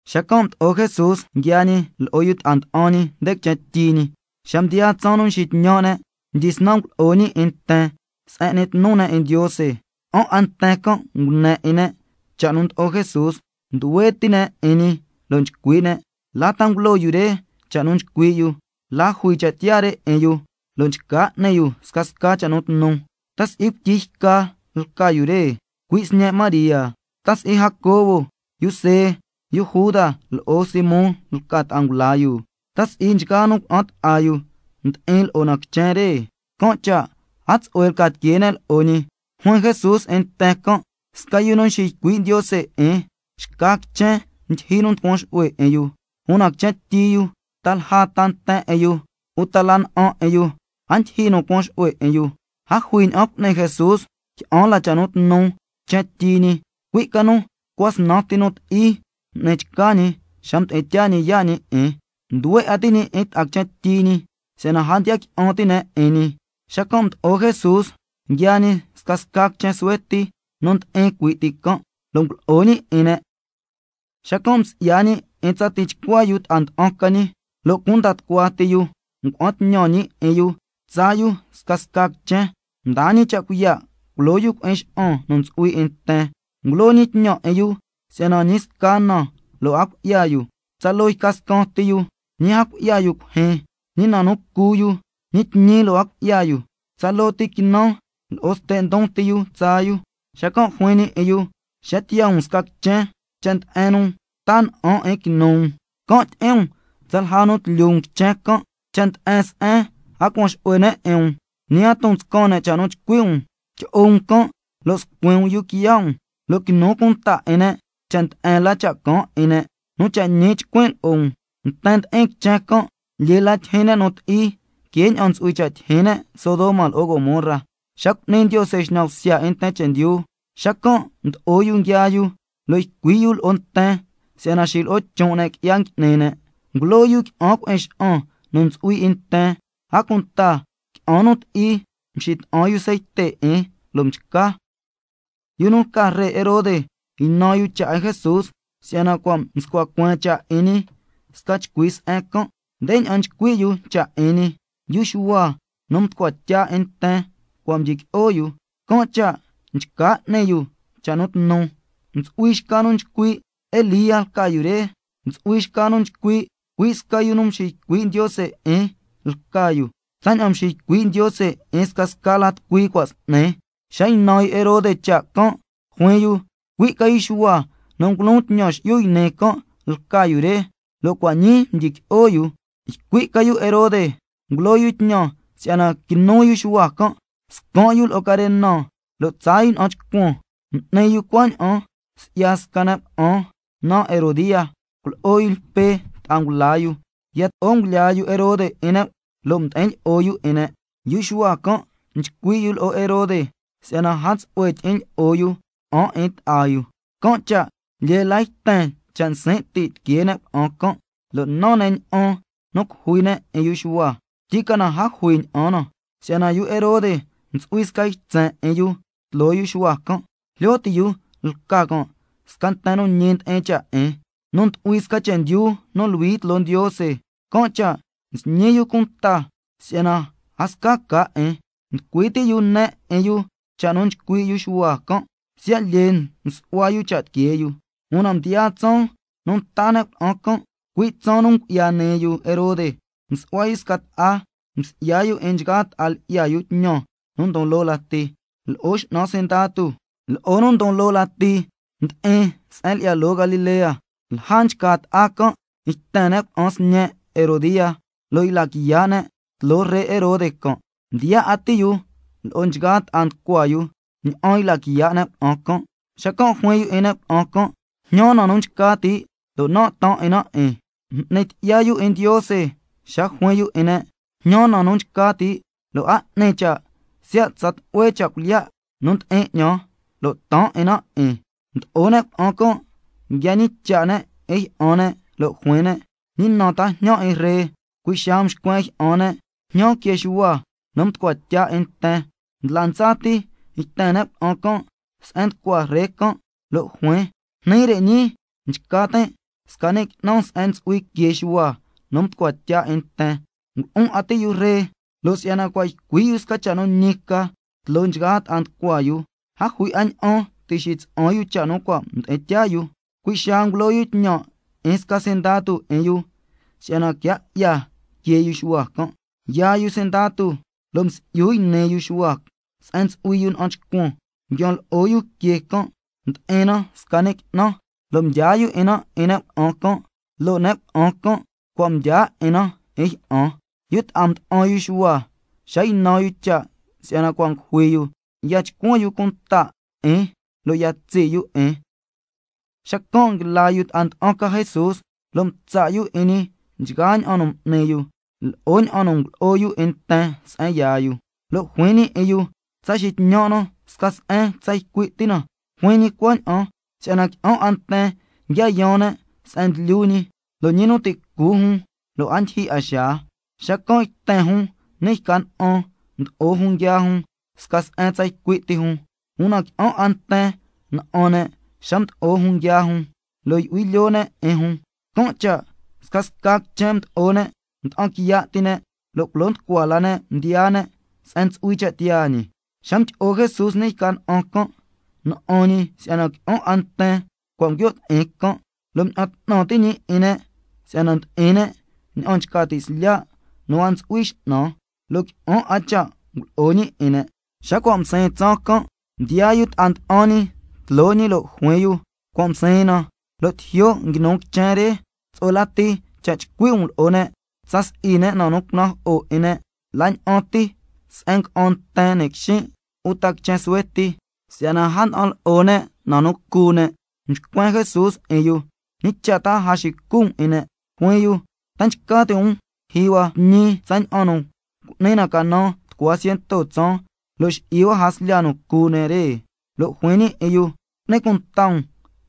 Xacan' mdo'o Jesús nguiaa ñi lo'o yu ta'a nda'an ñi nde quichen tyi ñi. Xa mdiyaa tsaan nu nxitñan' ne', mdyisnan ngulo'o ñi 'in nten ndi'in se'en n'ni tnu ne' 'in Ndiose. Qui'an 'a nten can' ngune 'in ne' cha' nu ndlo'o Jesús, nduhue ti' ne' 'in ñi, lo' nchcui' ne': ¿La ta ngulo yu re cha' nu nchcui' yu? ¿La jui cha' tiyaa re 'in yu, lo' nchca n'ni yu scasca cha' nu tnu? ¿Ta si'i cuityi yca lca yu re, cui' sñe' María? ¿Ta si'i Jacobo, yu See, yu Juda lo'o Simón lca ta'a ngula yu? ¿Ta si'i nchgaa nu cuna'an ta'a yu ndi'in lo'o na quichen re? Can' cha' a tsu'hue lca tiquee ne' lo'o ñi. Juin Jesús 'in nten can': Sca yu nu nxiycui' Ndiose 'in, xca quichen ndyijyi nu nducuan xu'hue 'in yu, una quichen tyi yu, ta lja ta nten 'in yu, uta la na'an 'in yu, a ndyijyi nu cuan xu'hue 'in yu. A jui ña'an cu'ni Jesús qui'an la cha' nu tnu quichen tyi ñi, cui' ca nu tucua snan ti nu ti'i m'ni chca ñi, xa mdi'in tyaa ñi yaa' ñi 'in. Nduhue 'a ti' ñi 'in ta'a quichen tyi ñi si'yana a ndiya qui'an ti' ne' 'in ñi. Xacan' mdo'o Jesús, nguiaa ñi scasca quichen suhue ti nu ndi'in cui' ti can', lo' ngulo'o ñi 'in ne'. Xacan' msi'ya ñi 'in tsa tichcua yu ta'a nda'an ca ñi, lo' cunda tucua ti yu ngua'an tñan ñi 'in yu tsaa yu scasca quichen, mdaa ñi cha' cuiya' culo yu cui'in xa'an nu ntsu'hui 'in nten. Ngulo ñi tñan 'in yu si'yana ñi sca na lo' a cui'ya yu, tsaloo yca scaan ti yu, ñi a cui'ya yu cuijyin, ñi na nu cu yu, ñi tñi lo' a cui'ya yu, tsaloo ti quinan lo'o ste' ndon ti yu tsaa yu. Xacan' juin ñi 'in yu: Xa tiyaa um sca quichen, cha' nde'en nu taa na'an 'in quinu um, can' tyi'in um tsalja nu quilyu um quichen can'. Cha' nde'en se'en a cuan xu'hue ne' 'in um, ñi a ton nscan ne' cha' nu chcui' um, tyi'o um can' lo' scuin um yuu quiya' um, lo' quinu cunta 'in ne' cha' nde'en la cha' caan 'in ne'. Nu cha' ñi chcuin' lo'o um, nten ndi'in quichen can', lyee la tyijyin ne' nu ti'i que ña'an ntsu'hui cha' tyijyin ne' Sodoma lo'o Gomorra, xa cu'ni Ndiose xñan bsya 'in nten chendyu. Xacan' mdo'o yu nguiaa yu, lo' ycui' yu lo'o nten si'yana xilo'o chon' ne' qui'ya ngui'ni ne'. Ngulo yu qui'an cui'in xa'an nu ntsu'hui 'in nten, a cunta qui'an nu ti'i mxita'an yu ceite 'in, lo' mchca. Yu nu lca ree Herode ynan yu cha' 'in Jesús, si'yana cua' mscua cueen cha' 'in ñi sca chcui se'en can'. Ndeña'an nchcui' yu cha' 'in ñi: Yu Xuhua nu mducua tya 'in nten cua' mdyiqui'o yu, can' cha' nchca n'ni yu cha' nu tnu. Ntsu'hui xca nu nchcui': Elía lca yu re. Ntsu'hui xca nu nchcui': Cui' sca yu nu nxiycui' Ndiose 'in lca yu, tsaña'an mxiycui' ñi 'in scasca la tucui cua' s'ni. Xa ynan yu Herode cha' can', juin yu: Cui' ca yu Xuhua nu ngulon tñan xi'yu yni can' lca yu re, lo' cua' ñii cua' mdyiqui'o yu. Ycui' ca yu Herode ngulo yu tñan si'yana quinu yu Xuhua can', scan' yu lo'o carena lo' tsaa yu na'an chcuan. M'ni yu cuaña'an si'ya sca ne' cuna'an naan Herodía, cuilyi'o yu Lpe ta'a ngula yu, yato'o ngulyaa yu Herode 'in ne' lo' ndi'in lyi'o yu 'in ne'. Yu Xuhua can' nchcui' yu lo'o Herode si'yana a tsu'hue tyi'in lyi'o yu cuna'an 'in ta'a yu. Can' cha' lyee la yten cha' nsin' ti' tiquee ne' cuna'an can', lo' nan ne' ña'an nu cujui ne' 'in yu Xuhua, tyicana a jui ña'an na, si'yana yu Herode ntsu'hui sca ytsen 'in yu tloo yu Xuhua can', jlyo ti' yu lca can' sca nten nu ñi ndi'in cha' 'in, nu ndu'hui sca chendyu nu luhui tloo Ndiose, can' cha' nxñi yu cunta si'yana a sca ca 'in. Nducui ti' yu ne 'in yu cha' nu nchcui' yu Xuhua can', siya' lyee nsu'hua yu cha' tiquee yu. Una mdiyaa tsaan nu nta ne' cuna'an can', cui' tsaan nu ngu'ya nii yu Herode, msu'hua yu sca ta'a. Msi'ya yu 'in nchgaa ta'a lyi'ya yu tñan nu ndon loo lati, lo'o x'nan sindatu, lo'o nu ndon loo lati ndi'in se'en lyi'ya loo Galilea. Lja nchca ta'a can' yten ne' cuna'an sñe' Herodía lo' yla quiya' ne' tloo ree Herode can', mdiyaa 'a ti' yu lo'o nchgaa ta'a nducua yu ña'an yla quiya' ne' cuna'an can'. Xacan' juin yu 'in ne' cuna'an can': Jñan na nu nchca ti', lo' nan' taan 'in na 'in. M'ni tyi'ya yu 'in Ndiose xa juin yu 'in ne': Jñan na nu nchca ti', lo' a 'ni cha' siya' tsa tlu'hue cha' cuilyiya' nu ndi'in 'ñan, lo' taan 'in na 'in. Mdo'o ne' cuna'an can', nguia ñicha' ne' 'in jyi'an ne', lo' juin ne': ¿Ñi na ta jñan 'in ree? Cui' xaa mxcuen jyi'an ne': Jñan que Xuhua nu mducua tya 'in nten. Ndla ndsa ti yten ne' cuna'an can' se'en nducua ree can', lo' juin: Jni re ñii nchca tin' sca qui'nan se'en ntsu'hui que Xuhua nu mducua tya 'in nten. Ngulu'un 'a ti' yu ree, lo' si'yana cua' ycui' yu sca cha' nu ñi ca tloo nchgaa ta'a nducua yu, a jui 'a ña'an ti' xitsa'an yu cha' nu cua' mdi'in tyaa yu. Cui' xaa ngulo yu tñan 'in sca sindatu 'in yu si'yana quia 'ya que yu Xuhua can'. Yaa yu sindatu lo' msi'yu yni yu Xuhua se'en ntsu'hui yu na'an chcuan, nguian lo'o yu que can' ndi'in na sca ni' qui'nan, lo' mdyaa yu 'in na 'in nu cuna'an can', lo' nu cuna'an can' cua' mdyaa 'in na 'in jyi'an. Yu ta'a mda'an yu Xuhua, xa ynan yu cha' si'yana cua' ngujui yu, ya chcuan yu cunta 'in, lo' ya tsi' yu 'in. Xacan' nguila yu ta'a nda'an ca Jesús, lo' mtsa' yu 'in ñi nchgaa ña'an nu m'ni yu, lo'o ña'an nu ngulo'o yu 'in nten se'en yaa yu. Lo' juin ñi 'in yu: Tsa xitñan' na sca se'en tsa ycui' ti na. Juin ñi cuaña'an si'yana qui'an 'a nten nguia yaan ne' se'en nguilyu ñi, lo' ñi nu ti' cu jun, lo' a ndyijyi 'a xaa. Xacan' yten jun ni' yca na'an, mdo'o jun nguiaa jun sca se'en tsa ycui' ti jun. Una qui'an 'a nten na'an ne' xa mdo'o jun nguiaa jun, lo' yu'hui lyoo ne' 'in jun, can' cha' scasca quichen mdo'o ne' mda'an quiya' ti ne', lo' culo nducua la ne' mdiyaa ne' se'en ntsu'hui cha' tiyaa ñi. Xa mdyi'o Jesús ni' yca na'an can', na'an ñi si'yana qui'an 'a nten cua' nguio' ti'in can', lo' mña'an 'tnan ti' ñi 'in ne' si'yana ndi'in ne' ña'an nchca ti' slya' nu a ntsu'hui x'nan. Lo' qui'an 'a cha' ngulo'o ñi 'in ne'. Xa cua' msiin tsaan can', mdiyaa yu ta'a nda'an ñi tloo ñi lo' juin yu: Cua' msiin na, lo' tijyo' nguinu quichen re. Tsu'hue lati cha' chcui' um lo'o ne', tsa si'i ne' na nu cunajo'o 'in ne', la ña'an ti se'en nga'an nten ni' quixin' uta quichen suhue ti, si'yana a nda'an lo'o ne' na nu cu ne'. Mxcuen Jesús 'in yu: ¿Ñi cha' ta a xicu um 'in ne'? Juin yu: ¿Ta nchca ti' um culyijyi hua tñi tsaña'an nu cu'ni na canan tucua ciento tsaan, lo' xi'i hua jaslya nu cu ne' re? Lo' juin ñi 'in yu: Cu'ni cunta um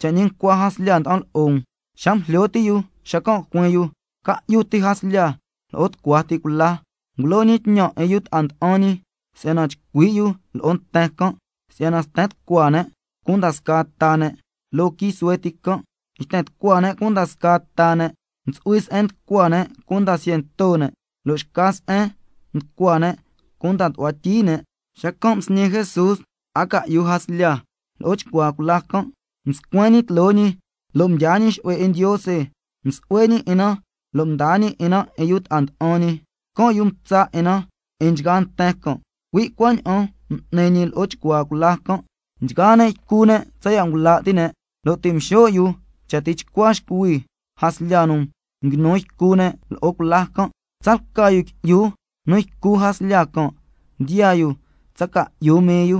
cha' ñi ncua jaslya nda'an lo'o um. Xa ngujlyo ti' yu xacan' juin yu: Ca'yu ti jaslya lo'o tucua ti cula. Ngulo ñi tñan 'in yu ta'a nda'an ñi si'yana chcui' yu lo'o nten can', si'yana sten tucua ne' cunda scaa ta ne' loo quii suhue ti can'. Yten tucua ne' cunda scaa ta ne': Ntsu'hui se'en nducua cunda ciento ne', lo' xca se'en nducua ne' cunda tu'hua tyi ne'. Xacan' msñi Jesús ta'a ca'yu jaslya lo'o chcuaa cula can', mscuen ñi tloo ñi nde ni' cuaan lo' mdyaa ñi xu'hue 'in Ndiose, msu'hue ñi 'in na lo' mdaa ñi 'in na 'in yu ta'a nda'an ñi. Can' yu mtsa 'in na 'in nchgaa nten can'. Cui' cuaña'an m'ni ñi lo'o chcuaa cula can'. Nchgaa ne' ycu ne' tsaya' ngula' ti' ne'. Lo' ti' mxo' yu cha tichcua xcuhui jaslya nu nguinu ycu ne' lo'o cula can'. Tsalca yu qui'yu nu ycu jaslya can' ndiyaa yu tsa ca'yu mii yu.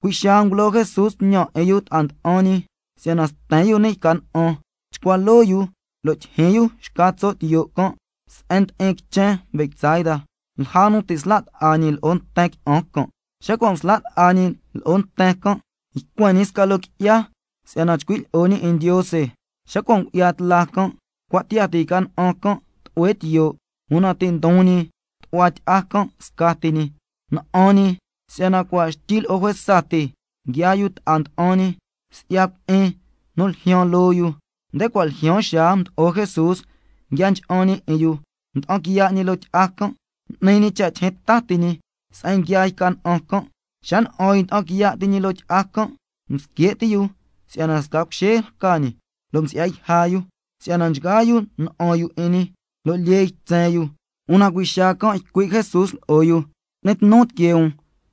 Cui' xaa ngulo Jesús tñan 'in yu ta'a nda'an ñi si'yana sten yu ni' yca na'an, chcua loo yu lo' tyijyin yu xca tso' tiyo' can' se'en ndi'in quichen Betsaida, lja nu ti' nsla' ta'a ñi lo'o nten qui'an can'. Xa cua' msla' ta'a ñi lo'o nten can', ycuen ñi sca loo qui'ya si'yana chcui' lyi'o ñi 'in Ndiose. Xa cua' ngu'ya tla can', cua' tiyaa ti yca na'an can' tlu'hue tiyo', una ti' ndon ñi tu'hua tyi'a can' scati ñi. Na'an ñi si'yana cua' xtyi lo'o juesa ti nguiaa yu ta'a nda'an ñi, si'ya cui'in nu ljyaan loo yu. Nde cua' ljyaan xaa mdo'o Jesús nguia ncha'an ñi 'in yu, mda'an quiya' ñi loo tyi'a can', m'ni ñi cha' tyijyin ta ti ñi se'en nguiaa yca na'an can'. Xa na'an yu nda'an quiya' ti ñi loo tyi'a can', msque' ti' yu si'yana sca cuxee lca ñi, lo' msi'ya yja yu, si'yana nchgaa yu na'an yu 'in ñi, lo' lyee ytsen yu. Una cui' xaa can' ycui' Jesús lo'o yu: Cu'ni tnu tiquee um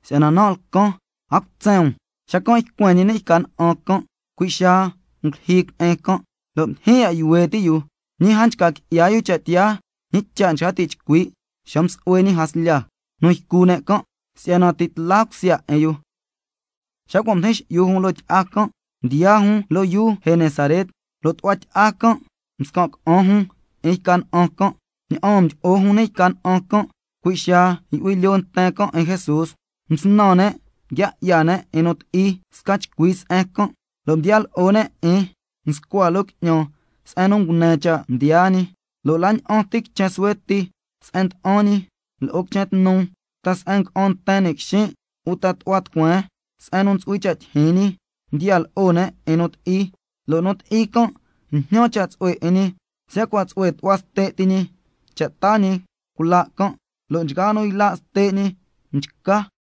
si'yana nan' lcan, a cutsen um. Xacan' ycuen ñi ni' yca na'an can', cui' xaa ngulyijyi cui'in can', lo' ndyijyin ya' yuhue' ti' yu. Ñi a nchca qui'ya yu cha' tiyaa, ñi cha' nchca ti' chcui' xa msu'hue ñi jaslya nu ycu ne' can', si'yana ti' nchcun cha' tiyaa 'in yu. Xa cua' mdijin xi'yu jun loo tyi'a can', mdiyaa jun loo yuu Genesaret. Lo' tu'hua tyi'a can' mscan' ca'an jun 'in yca na'an can'. Ña'aan mdyi'o jun ni' yca na'an can', cui' xaa yu'hui lyoo nten can' 'in Jesús. Msnan ne', nguia 'ya ne' 'in nu ti'i sca chcui se'en can', lo' mdiya lo'o ne' 'in nscua loo qui'ñan se'en nu ngune cha' mdiyaa ñi. Lo' la ña'an ti quichen suhue ti se'en nda'an ñi, lo'o quichen tnu, ta se'en nga'an nten ni' quixin', uta tu'hua tucueen se'en nu ntsu'hui cha' tyijyin ñi, ndiya lo'o ne' 'in nu ti'i. Lo' nu ti'i can' njñan cha' tsu'hue 'in ñi, siya' cua' tsu'hue tu'hua ste' ti ñi cha' taa ñi cula' can', lo' nchgaa nu yla' ste' ñi mchca.